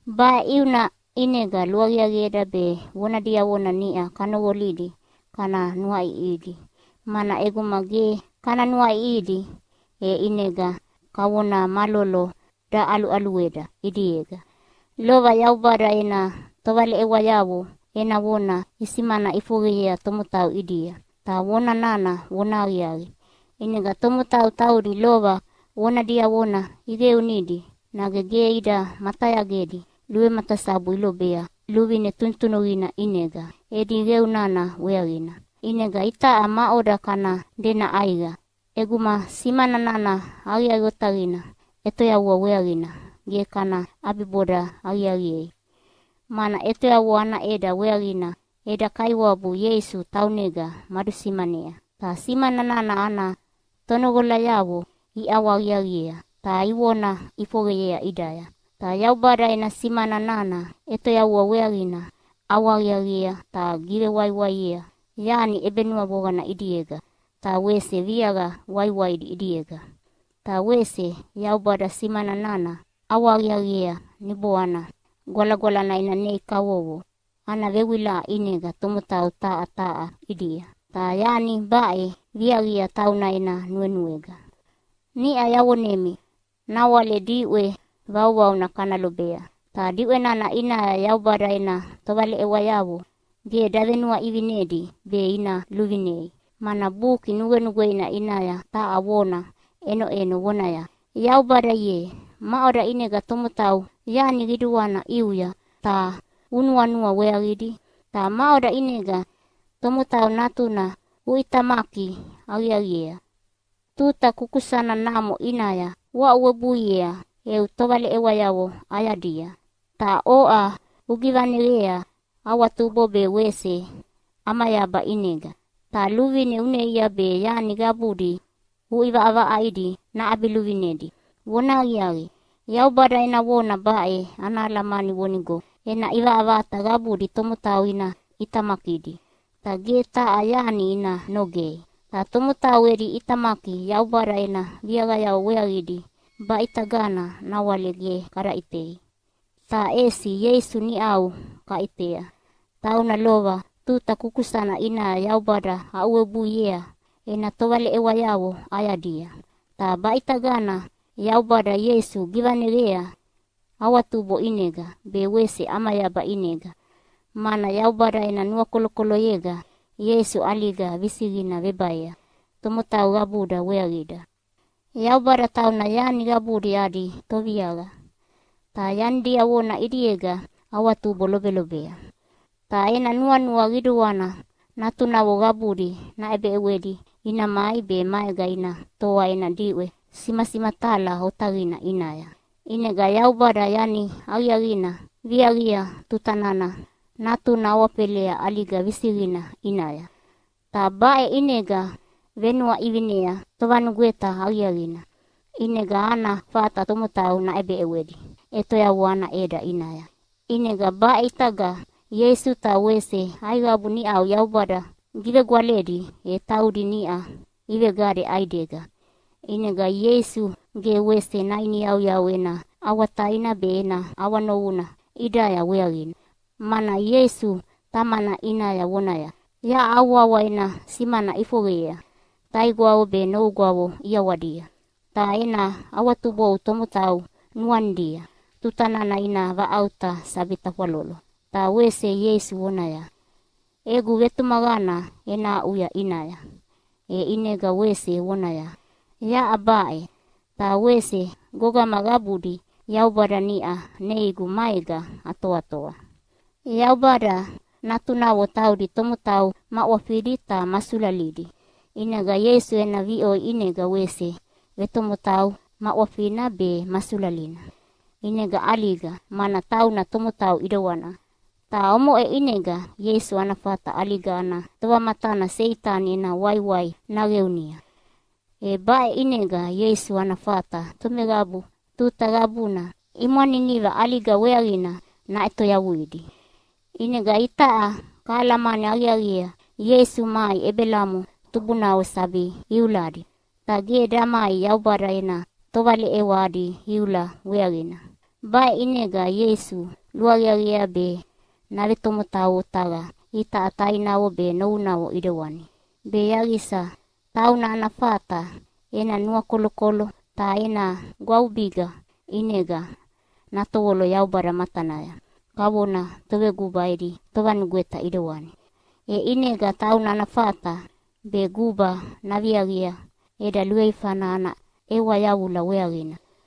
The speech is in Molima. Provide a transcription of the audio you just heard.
Baʼe ʼiuna ʼinega luaqiaqieda be vona diavona niʼa kanoqolidi kana nuaʼiʼihidi, mana ʼeguma ge kana nuaʼiʼihidi e ʼinega kavona malolo daʼaluʼalueda ʼidiega. Lova Yaubada ena tovaleʼewayavo ena vona isimana ʼifoqeyea tomotau ʼidia. Ta vona nana vonahaqiaqi. ʼInega tomotau taudi lova vona diavona iqeunidi nage ge ida matayagedi luvematasabu ilobea luvine tunutunuqina ʼinega edi qeu nana weaqina. ʼInega itaʼa maʼoda kana dena ʼaiqa ʼeguma simana nana aqiaqi otaqina ʼetoyavua weaqina ge kana ʼabiboda aqiaqiei? Mana ʼetoyavua ana ʼeda weaqina eda Kaiwabu Ieisu taunega madusimanea. Ta simana nana ana tonoqolayavo iʼawahaqiaqiea ta ivona ʼifoqeyea ʼidaya. Ta Yaubada ena simana nana ʼetoyavua weaqina ʼawahaqiaqiea ta givewaiwaiea yani ʼebenuavoqana ʼidiega ta wese viaqa waiwaidi ʼidiega. Ta wese Yaubada simana nana ʼawahaqiaqiea Niboana Gwalagwalana ena nei kavovo ana vewilaʼa ʼinega tomotau taha taha ʼidia. Ta yani baʼe viaqia tauna ena nuenuega. Niʼa yavonemi nawale diʼwe vauvauna kana lobea. Ta diʼwe nana ʼinaya Yaubada ena tovaleʼewayavo ge davenuaʼivinedi be ina luvinei. Mana Buki Nugwenugweina ʼinaya taha vona ʼenoʼeno vonaya, “Yaubada ye, maʼoda ʼinega tomotau yani qiduana ʼiuya ta unuanua weaqidi? Ta maʼoda ʼinega tomotau natuna uʼitamaki aqiaqiea? Tuta kukusana namo ʼinaya uaʼuwebuiea eu tovaleʼewayavo ʼayadia. Ta oʼa ugivaneqea awatubo be wese ʼamayaba ʼinega. Ta luvine uneia be yani qabudi uʼivaʼavaʼaidi naʼabiluvinedi.” Vonahaqiaqi, Yaubada ena vona baʼe ana alamani vonigo ena ʼivaʼavaʼata qabudi tomotau ina ʼitamakidi, ta ge taha yani ina nogei. Ta tomotau edi ʼitamaki Yaubada ena viaqayavo weaqidi baʼitagana nawale ge kada ʼitei. Ta ʼesi Ieisu niʼau kaʼitea. Tauna lova tuta kukusana ʼinaya Yaubada aʼuwebuiea ena tovaleʼewayavo ʼayadia, ta baʼitagana Yaubada Ieisu givaneqea awatubo ʼinega be wese ʼamayaba ʼinega, mana Yaubada ena nuakolokoloyega Ieisu ʼaliga visiqina vebaea tomotau qabuda weaqida. Yaubada tauna yani qabudi adi Toviaqa, ta yani diavona ʼidiega awatubo lobelobea. Ta ena nuanua qiduana natunavo qabudi naʼebeʼewedi ina mai be maega ina toa ena diʼwe simasimatala otaqina ʼinaya. ʼInega Yaubada yani aqiaqina viaqia tuta nana Natuna awafelea ʼaliga visiqina ʼinaya. Ta baʼe ʼinega venuaʼivinea tovanugweta aqiaqina, ʼinega ana fata tomotau naʼebeʼewedi ʼetoyavua ana ʼeda ʼinaya. ʼInega baʼe ʼitaga Ieisu ta wese aiqabu niʼau Yaubada givegwaledi, e taudi niʼa ivegade ʼaidega. ʼInega Ieisu ge wese nainiyauyau ena ʼawataina be ena ʼawanovuna ʼidaya weaqina. Mana Ieisu Tamana ʼinaya vonaya, “Yaʼa au wawa ena simana ʼifoqeyea taigwavo be novugwavo ʼiawadia. Ta ena awatubou tomotau nuanidia tuta nana ina vaʼauta sabi tafwalolo.” Ta wese Ieisu vonaya, “Egu vetumaqana ena aʼuya ʼinaya.” E ʼinega wese vonaya, “Yaʼa baʼe, ta wese gogama qabudi Yaubada niʼa neigu maega atoatoa.” Yaubada natunavo taudi tomotau ma ʼwafidi ta ma sulalidi, ʼinega Ieisu ena viʼoi ʼinega wese vetomotau ma ʼwafina be ma sulalina. ʼInega ʼaliga, mana tauna tomotau ʼidewana. Ta omoʼe ʼinega Ieisu ana fata ʼaliga ana tovamatana Seitani ena waiwai naqeunia. E baʼe ʼinega Ieisu ana fata tomeqabu tuta qabuna imwaniniva ʼaliga weaqina naʼetoyavuidi. ʼInega itaʼa kahalamani aqiaqiea Ieisu mai Ebelamo tubunavo sabi iuladi, ta ge damai Yaubada ena tovaleʼewa adi iula weaqina. Baʼe ʼinega Ieisu luaqiaqiea be navetomotau otaqa itaʼa tainavo be novunavo ʼidewani, be yaqisa tauna ana fata ena nuakolokolo ta ena gwavubiga ʼinega natovolo Yaubada matanaya kavona toveguba edi tovanugweta ʼidewani. E ʼinega tauna ana fata be guba naviaqia eda luveifana ana ʼewa yavula weaqina.